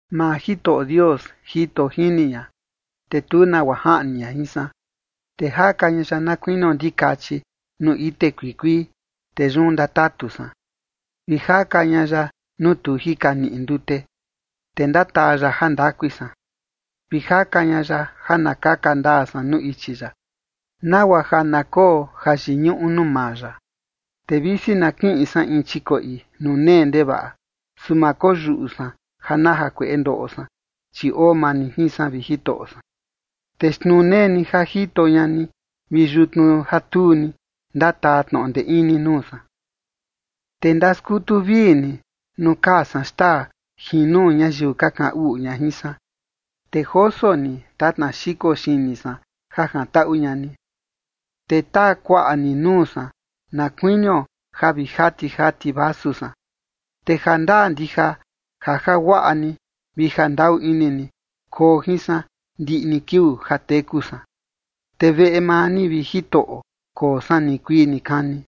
Maa Jitoꞌo Dios jito jini ña, te tu nagua jaꞌni ña jin san. Te jaka ña ya na kuinio ndikachi nuu ite kuikuii, te yun ndatatu san, vi jaka ña ya nuu tu jika niꞌi ndute. Te ndataa ya jandakui san, vi jaka ña ya ja na kaka ndaa san nuu ichi ya, nagua ja na koo jayiñuꞌu nuu maa ya. Te visi na kiꞌin san in chikoꞌi nuu nee ndevaꞌa, su ma koyuꞌu san ja na jakueꞌe ndoꞌo san, chi oo maa ni jin san, vi Jitoꞌo san, te xtnuu nee ni ja jito ña ni vi yutnu ja tuu ni, ndataa tnoꞌo ndee ini nuu san. Te ndaskutu vii ni nuu kaa san xtaa jin nuu ñayiu ka kaꞌan uꞌu ña jin san, te joso ni tatna xiko xini san ja jantaꞌu ña ni, te taa kuaꞌa ni nuu san na kuinio ja vi jati jati vasu san. Te jandaa ndija ja jaguaꞌa ni vi jandaꞌu ini ni koo jin san ndiꞌi ni kiuu ja teku san, te veꞌe maa ni, vi Jitoꞌo, koo san nikuii nikani.